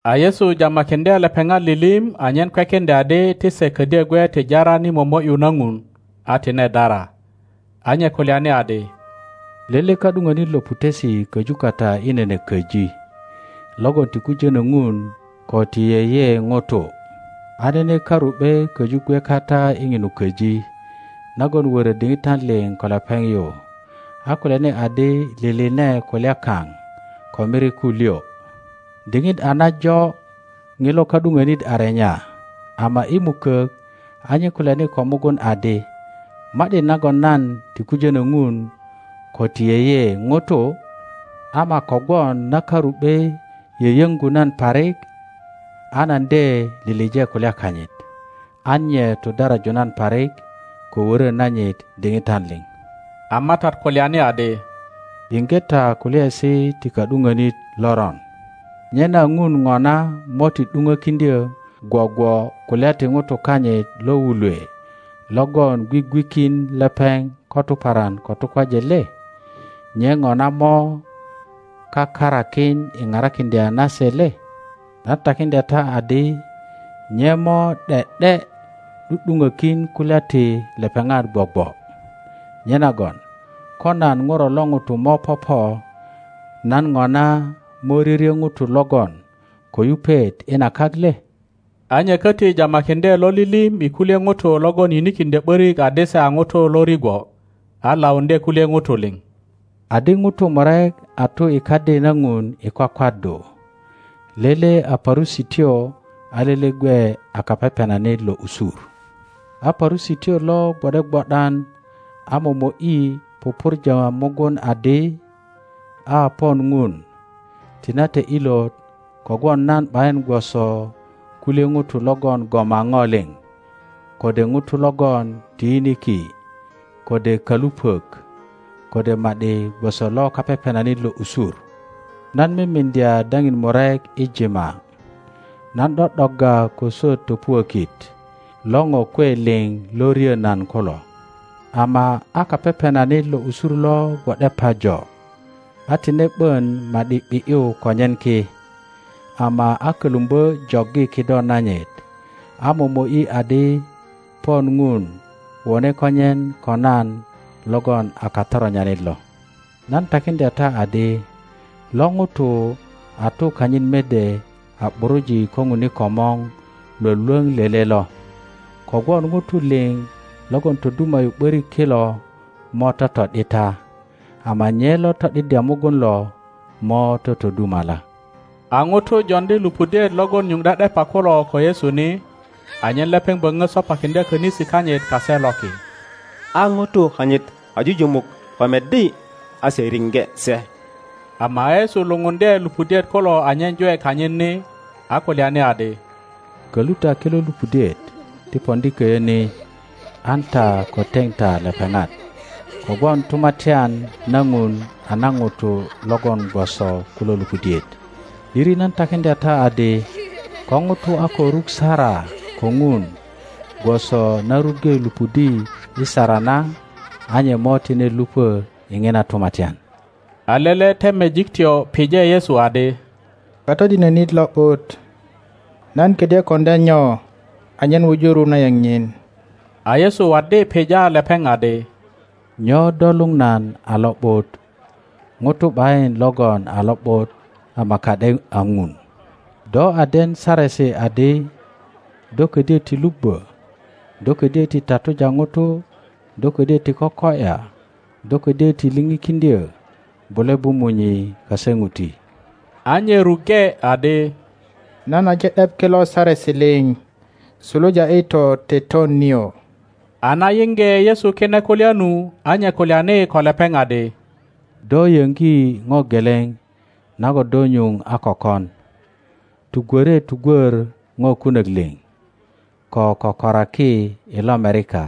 A Yesu jamakiŋdye lepeŋ atilim anyen kwekiŋdya adi ti se ködyö gwe ti jaran i momo ’yu na Ŋun, a tine dara. A nye kulyani adi, Lele ka ’duŋonit lo putesi köju kata i nene köji, logon ti kujono Ŋun ko ti yeye ŋutu. A nene karu ’be köju gwe kata i ŋinu köji, nagon wörö diŋitan liŋ ko lepeŋ yu, a kulyani adi, Liline kulya kaŋ ko miriku liŋ. Diŋit a najo ŋilo ka ’duŋonit a renya, ama i mukok a nye kulyani ko mugun adi, Ma ’di nagon nan ti kujönö Ŋun ko ti yeye ŋutu, ama kogwon na karu ’be yöyoŋgu nan parik, a nan de lilije kulya kanyit, an nye tudaraju nan parik ko wöro nanyit diŋitan liŋ. A MATAT kulyani adi, Yiŋge ta kulyaesi ti ka ’duŋönit loron. Nyena Ŋun ŋona mo ti ’duŋokiŋdyö gwogwo kulya ti ŋutu kanyit lo wulwe logon gwigwikin lepeŋ ko tuparan ko tukwaje le? Nye ŋona mo kakarakin i parakiŋdya na se le? Nan takiŋdya ta adi, Nye mo ’de ’de ’du ’duŋökin kulya ti lepeŋat gwogwo. Nyenagon ko nan ŋuro lo ŋuto mo popo, nan ŋona mo ryoryö ŋutu logon ko yupet i na kak le? A nye köti jamakiŋdye lo lilim i kulye ŋutu logon yinikiŋdyo ’borik adi se a ŋutu lo rigwo, a lauŋdye kulye ŋutu liŋ. Adi, Ŋutu murek a tu i Kadi na Ŋun i kwakwaddu; lele a Parusityo, a lele gwe a kapepenanit lo usur. A Parusityo lo gwo ’de gwo ’dan a momo ’yi pupurja mugun adi, A pon Ŋun, tinate ilot kogwon nan ’bayin gwoso kulye ŋutu logon goma ŋo liŋ, kode ŋutu logon ti yiniki, kode kalupok, kode ma ’di gwoso lo kapepenanit lo usur. Nan mimiŋdya daŋin murek i jima, nan ’do ’dogga ko swöt topuökit lo ŋo kwe liŋ lo ryo nan kulo. Ama a kapepenanit lo usur lo gwo ’de pajo, a tine ’bon ma ’di ’bi ’yu konyen ki, ama a kolumbö joggi kido nanyit, a momo ’yi adi, Pon ŋun, wone konyen ko nan logon a katoronyanit lo. Nan takiŋdya ta adi, Lo ŋuto a tu kanyit mede a ’buruji ko ŋun i komor Iwolwoŋ lele lo; kogwon ŋutu liŋ logon toduma ’yu ’börik kilo mo toto ’dita, ama nye lo to ’diddya mugun lo mo totodumala. A ŋutu joŋdi lupudiet logon nyuŋ ’de ’depa kulo ko Yesu ni, anyen lepeŋ böŋo sopakiŋdya konisi kanyit kase loki; a ŋutu kanyit kajujumuk ko meddi, a se riŋge se. Ama a Yesu lupundye lupudiet kulo anyen jwe kanyit ni, a kulyani adi, Kolu ta kilo lupudiet ti poŋdi koyö ni, an ta ko teŋ ta lepeŋat; kogwon Tumatyan na Ŋun a na ŋutu logon gwoso kulo lupudiet. ’Diri nan takiŋdya ta adi, Ko ŋuto a ko ruk sara ko ŋun gwoso na ruŋge lupudi i sara na, a nye mo tine lupö i ŋina tumatyan. A lele temejiktyo pije Yesu adi, Katodinönit lo ’but; nan kodyö koŋdya nyo anyen wuju ru na yeŋ nyin? A Yesu waddi pija lepeŋ adi, Nyo do luŋ nan a lo ’but? Ŋuto ’bayin logon a lo ’but ama ka ’de a Ŋun. Do a den Saresi adi, Do kodyö ti lubbö, do ködyo ti tatuja ŋuto; do ködyo ti koko ’ya; do ködyö ti lipikiŋdyö; bule bu munyi kase ŋuti. a nye ruŋge adi, Nan aje ’dep kilo saresi liŋ suluja i toteton nio. a na yiŋge Yesu kine kulya nu, a nye kulyani ko lepeŋ adi, Do yoŋgi ŋo geleŋ nagon do nyuŋ a ko kon. Tugwore tugwor ŋo kunök liŋ, ko kökoraki i lomerika,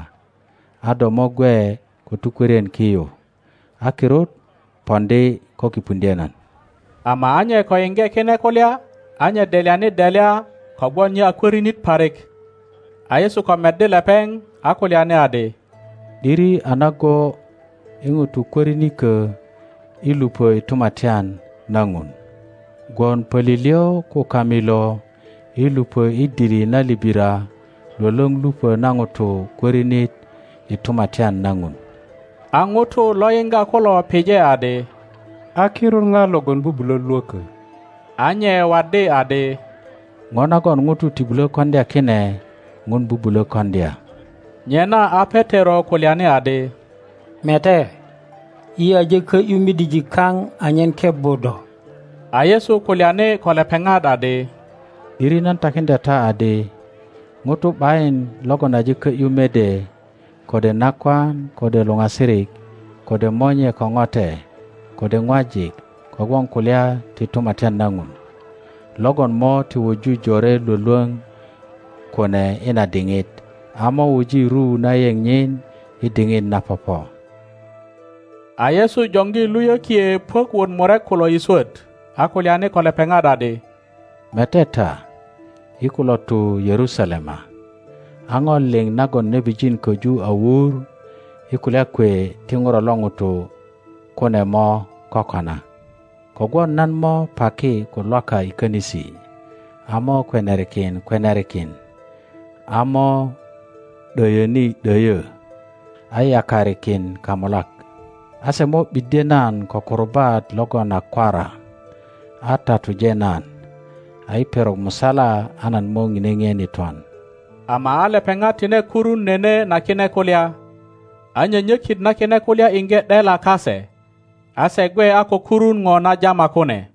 a do mo gwe ko tukwörien ki yu, a kirut poŋdi ko kipuŋdye nan. Ama a nye ko yiŋge kine kulya, a nye delyani delya, kogwon nye a kwörinit parik. a Yesu ko meddi lepeŋ, a kulyani adi, ’Diri a nago i ŋutu kwörinikö i lupö i Tumatyan na Ŋun. Gwon polilyö ko kamilo i lupö i dili na libira lwölwöŋ lupö na ŋuto kwörinit i Tumatyan na Ŋun. A ŋutu lo yiŋga kulo pije adi, A kirut ŋa logon bubulö lwökö? a nye waddi adi, Ŋo nagon ŋutu ti bulo koŋdya kine Ŋun bubulo koŋdya. Nyena a Petero kulyani adi, Mete, yi aje ko ’yu midijik kaŋ anyen kebbu do. A Yesu kulyani ko lepeŋat adi, ’Diri nan takiŋdya ta adi, ŋuto ’bayin logon aje kö ’yu mede, kode nakwan, kode luŋasirik, kode monye ko ŋote, kode ŋwajik, kogwon kulya ti Tumatyan na Ŋun, logon mo ti wuju jore lwölwöŋ kune i na diŋit, a mo wuji ru na yeŋ nyin i diŋit na popo. A Yesu joŋgi luyökie puök wot murek kulo i swöt, a kulyani ko lepeŋat adi, Mete ta, yi kulo tu Yerusalema, a ŋo liŋ nagon nebijin koju a wur i kulya kwe ti ŋuro lo ŋuto kune mo kokona. Kogwon nan mo paki ko Lwaka i könisi, a mo kweniarikin kweniarikin, a mo ’döyöni ’döyö, a yakarikin kamulak; a se mo ’biddye nan ko kurubat logon a kwara, a tatuje nan, a i perok musala a nan mo ŋine ŋien i twan. Ama a lepeŋat tine kurun nene na kine kulya; a nyonyökit na kine kulya iŋge ’dela kase, a se gwe a ko kurun ŋo na jama kune.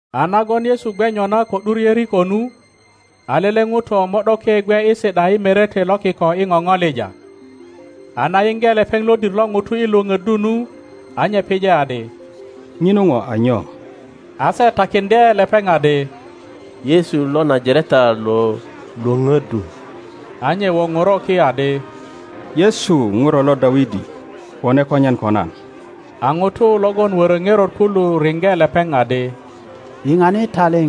A nagon Yesu gwe nyona ko ’dur Yeriko nu, a lele ŋuto mo ’doke gwe i si ’da i merete lo kiko i ŋoŋolija. a na yiŋge lepeŋ lodir lo ŋutu i lwöpöddu nu, a nye pije adi, Ŋinu ŋo a nyo? A se takiŋdye lepeŋ adi, Yesu lo Najareta lo lwöpöddu. A nye woŋoro ki adi, Yesu! Ŋuro lo Dawidi, wone kanyen ko nan! a ŋutu logon woro ŋerot kulu riŋge lepeŋ adi, Yiŋani taliŋ!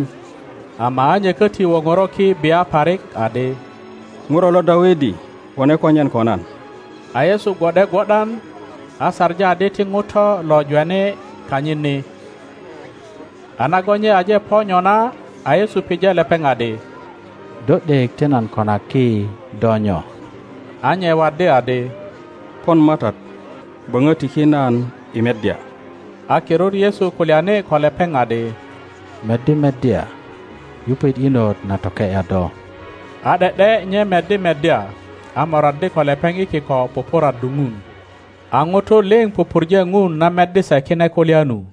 Ama a nye koti woŋoro ki bia parik adi, Ŋuro lo Dawidi, wone konyen ko nan! A Yesu gwo ’de gwo ’dan, a saŋi adi ti ŋuto lo jweni kanyit ni; a nagon nye aje po nyona, a Yesu pije lepeŋ adi, Do ’dek ti nan konaki do nyo? A nye waddi adi, Pon matat, böŋö tiki nan i meddya. a kirut Yesu kulyani ko lepeŋ adi, Meddi meddya; yupet inot na toke ’ya do. a ’de ’de nye meddi meddya, a moraddi ko lepeŋ i kiko pupuraddu Ŋun, A ŋutu liŋ pupurje Ŋun na meddi se kine kulya nu.